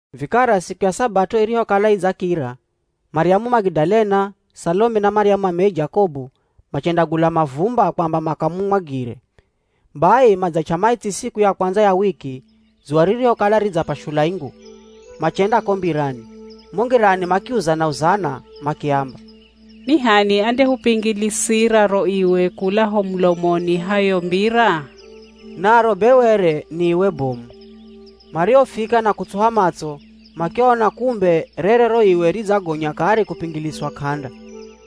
Vikara siku ya Sabato irihokala idzakira, Maryamu Magidalena, Salome na Maryamu mameye Jakobu machendagula mavumba kwamba makamumwagire. Bai madzach'a maitsi siku ya kwandza ya wiki, dzuwa ririhokala ridzapashula ingu, machenda ko mbirani. Mo ngirani makiuzana-uzana makiamba, “Ni h'ani andehupingilisira ro iwe kula ho mulomoni ha yo mbira?” Naro be were ni iwe bomu. Marihofika na kutsuha matso makiona kumbe rere ro iwe ridzagonya kare kupingiliswa k'anda.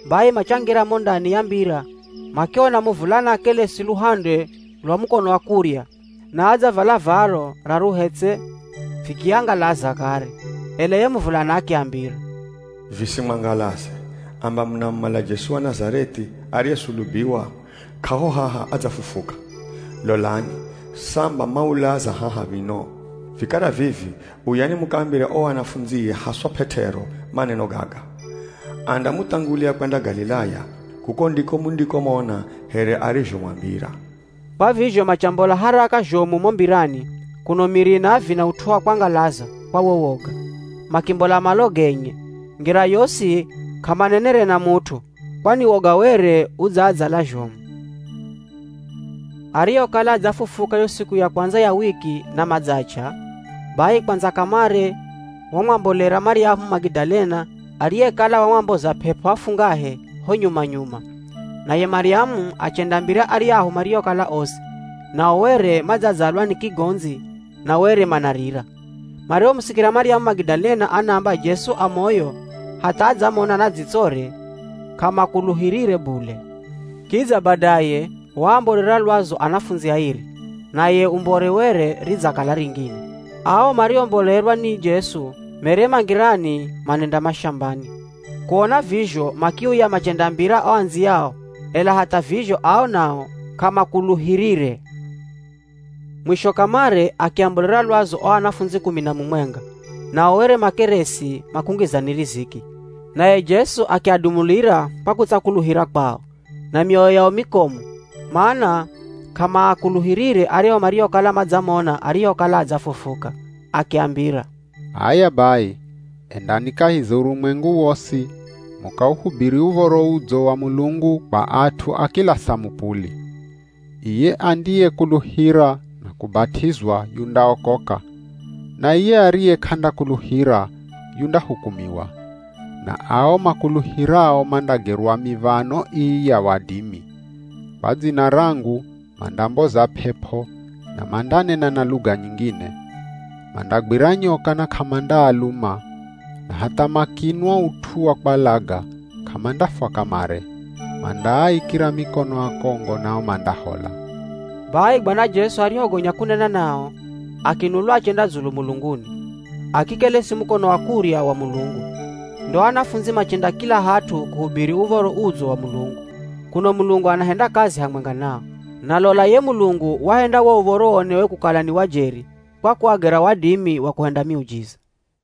Bai machangira mo ndani ya mbira makiona muvulana akelesi luhande lwa mukono wa kurya na adzavala valo raruhe tse! Vikiangalaza kare. Ela ye muvulana akiambira, “Visimwangalaze, amba munamumala Jesu wa Nazareth'i ariyesulubiwa, k'aho haha adzafufuka. Lolani, samba maulaza haha mino! Vikara vivi uyani mukaambire o anafundzie haswa P'et'ero maneno gaga, ‘Andamuthangulia kwenda Galilaya, kuko ndiko mundikomona here arizhomwambira.’” Kwa vizho machambola haraka zhomu mo mbirani kuno miri inaavina ut'u wa kwangalaza kwa wo woga. Makimbola malo genye. Ngira yosi k'amanenere na mut'u kwani woga were udzaadzala zhomu. [ Arihokala adzafufuka yo siku ya kwandza ya wiki na madzach'a, bai kwandza kamare wamwambolera Maryamu Magidalena ariyekala wamwamboza p'ep'o afungahe ho nyuma-nyuma. Naye Maryamu achendaambira aryahu mariokala osi, nao were madzadzalwa ni kigondzi na were manarira. Marihomusikira Maryamu Magidalena anaamba Jesu a moyo hatha adzamona na dzitsore, k'amakuluhirire bule. Kidza badaye waambolera lwazu anafundzi airi, naye umbore were ridzakala ringine. Ao mariombolerwa ni Jesu mere ma ngirani manenda mashambani. Kuona vizho makiuya machendaambira o andziyao ela hatha vizho ao nao k'amakuluhirire. Mwisho kamare akiambolera lwazu o anafundzi kumi na mumwenga, nao were makeresi makungizani riziki. Naye Jesu akiadumulira kwa kutsakuluhira kwao, na mioyo yao mikomu mana k'amaakuluhirire aryahu mariokala madzamona arihokala adzafufuka. Akiambira, “H'aya bai endani kahi za urumwengu wosi mukauhubiri Uv̱oro Udzo wa Mulungu kwa at'u a kila samupuli. Iye andiyekuluhira na kubat'izwa yundaokoka, na iye ariye k'andakuluhira yundahukumiwa. Na ao makuluhirao mandagerwa miv̱ano ii ya wadimi. Kwa dzina rangu mandamboza p'ep'o na mandanena na luga nyingine. Mandagwira nyoka na k'amandaaluma, na hatha makinwa ut'u wa kwalaga, k'amandafwa kamare, mandaaikira mikono akongo nao mandahola.” Bai Bwana Jesu arihogonya kunena nao, akinulwa achenda dzulu mulunguni, akikelesi mukono wa kurya wa Mulungu. Ndo o anafundzi machenda kila hat'u, kuhubiri Uv̱oro Udzo wa Mulungu, kuno Mulungu anahenda kazi hamwenga nao. Na lola ye Mulungu wahenda wo uv̱oro uonewe kukala ni wa jeri kwa kuagera wadimi wa kuhenda miujiza.]